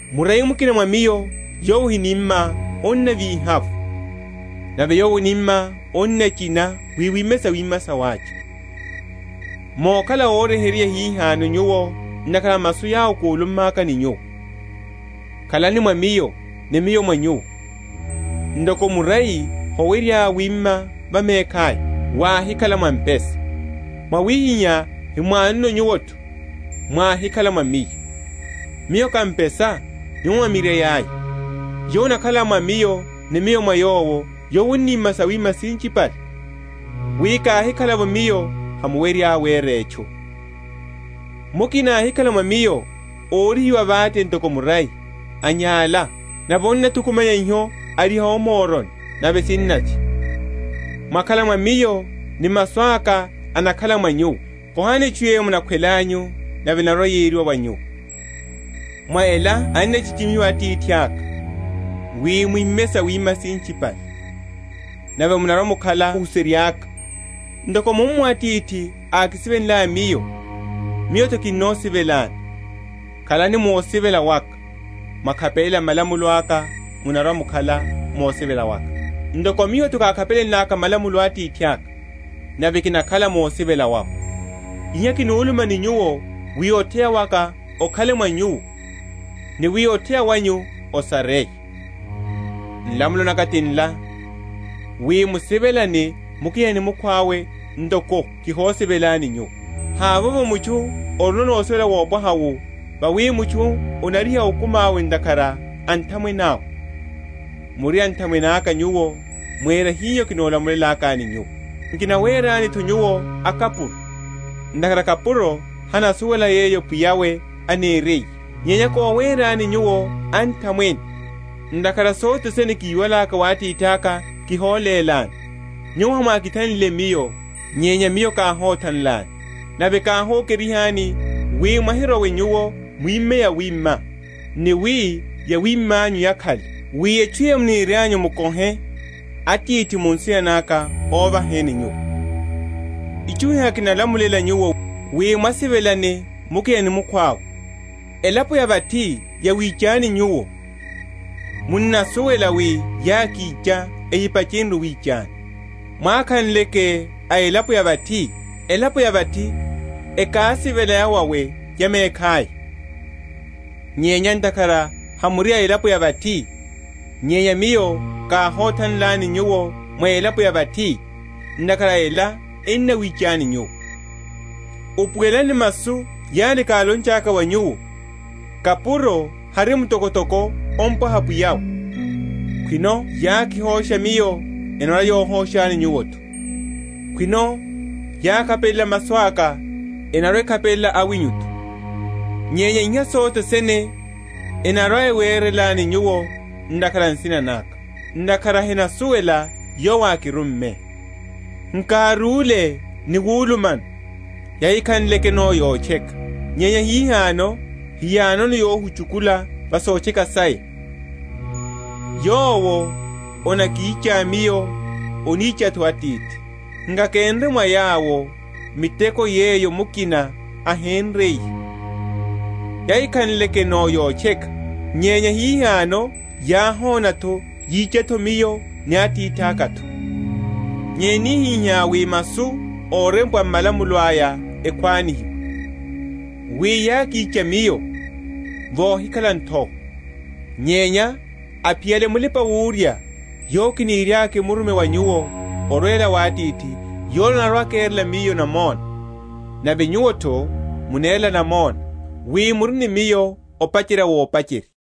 Murai mukina mwa Miyo yowo ohiníma, annavíha’vo: nave yowo oníma, annachina, wi wime sawima sawacha. Mokhala óryeheryeya hihano nyuwo ntakhara a masu yawo kúlummaka ni nyuwo. Khalani mwa Miyo, ni Miyo mwa nyuwo. Ntoko murai howerya wima va mekhaya, wáhikhala mwa mpesa; mwawihiha hemwanono nyuwo’tho, mwáhikhala mwa Miyo. Miyo ká mpesa, nyuwo mwá mirai aya: yowo anakhala mwa Miyo, ni Miyo mwa yowo, yowo aníma sawima sinchipale; wi káhikhala’vo Miyo hamuwerya wera etchu. Mukina áhikhala mwa Miyo, órihiwa vate ntoko murai, anyála; nave anathuku?-?manya iho ariha o moroni, nave sinavya. Mwakhala mwa Miyo, ni masu aka anakhala mwa nyuwo, kohani etchu yeyo munakhwelanyu, nave enarwa‐yeriwa wa nyuwo. Mwa ela annachichimihiwa Atithaka, wi mwime sawima sinchipale; nave munarwa‐mukhala óhuserya’ka. Ntoko mummo Atithi ákisivelenlaya Miyo, Miyo’tho kihosivelani: khalani mu osivela waka. Mwakhapelela malamulo aka munarwa‐mukhala mu osivela waka; ntoko Miyo kokhapelela malamulo a Atithaka, nave kinakhala mu osivela wawe. Iha kihuluma ni nyuwo, wi otheya waka okhale mwa nyuwo, ni wi otheya wanyu osareye. Nlamulo naka ti nla, wi, musivelane mukina ni mukhwawe, ntoko kihosivelani nyuwo. Havovo mutchu orino osivela wopwaha wu wawi mutchu anariha okumi awe ntakhara a anthamwene awe. Muri anthamwene aka nyuwo, mwera hiho kinolamulelakani nyuwo. Nkinawerani’tho nyuwo akapuro; ntakhara kapuro hanasuwela yeyo pwiya’we aneriye; nyenya kowerani nyuwo anthamwene; ntakhara sothe sene kiwalaka wa Atithaka kiholélani. Nyuwo hamwákithanlile Miyo, nyenya Miyo káhothanlani, nave káhokerihani, wi mwahirowe nyuwo mwime yawima, ni wi yawima’nyu yakhale: wi etchu yeyo munirianyu mukohe Atithi mu nsina naka óvaheni nyuwo. Itchu iha kinalamulela nyuwo, wi mwasivelane mukina ni mukhwawe. Elapo ya vathi yawichani nyuwo, munasuwela wi yákicha ehipachenrye owichani. Mwákhanleke a elapo ya vathi, elapo ya vathi ekásivela yawawe ya mekhaya; nyenya ntakhara hamuri a elapo ya vathi, nyenya Miyo káhothanlani nyuwo mwa elapo ya vathi, ntakhara a ela ennawichani nyuwo. Upuwelani masu yale kálonchaka wa nyuwo, Kapuro hari mtokotoko opwaha Pwiya’we. Khwino yákihosha Miyo, enarwa‐yohoshani nyuwo’tho; khwino yákhapelela masu aka, enarwa‐ekhapelela awinyu’tho. Nyenya iha sothene enarwa‐ewerelani nyuwo ntakhara a nsina naka, ntakhara henasuwela Yowo ákirumme. Nkárúle ni wulumano, yahikhanlekeno yotcheka; nyenya hihano heyanono yohuchukula va sotcheka saya. Yowo anakicha Miyo, anicha’tho Atithi. Nkakénre mwa yawo miteko yeyo mukina ahénriye, yahikhanlekeno yotcheka; nyenya hihano yáhona’tho yicha’tho Miyo ni Atithaka’tho. Nyenya enihihá, wi masu órempwa m’malamulo aya ekhwanihiwe, wi, Yákicha Miyo vohikhala nthowa. Nyenya aphiyale Mulipa‐wurya, yowo kiniriaka kimurume wa nyuwo orwela wa Atithi, yola anarwa‐akerela Miyo namona. Nave nyuwo’tho munerela namona, wi muri ni Miyo opacherya vopacherya.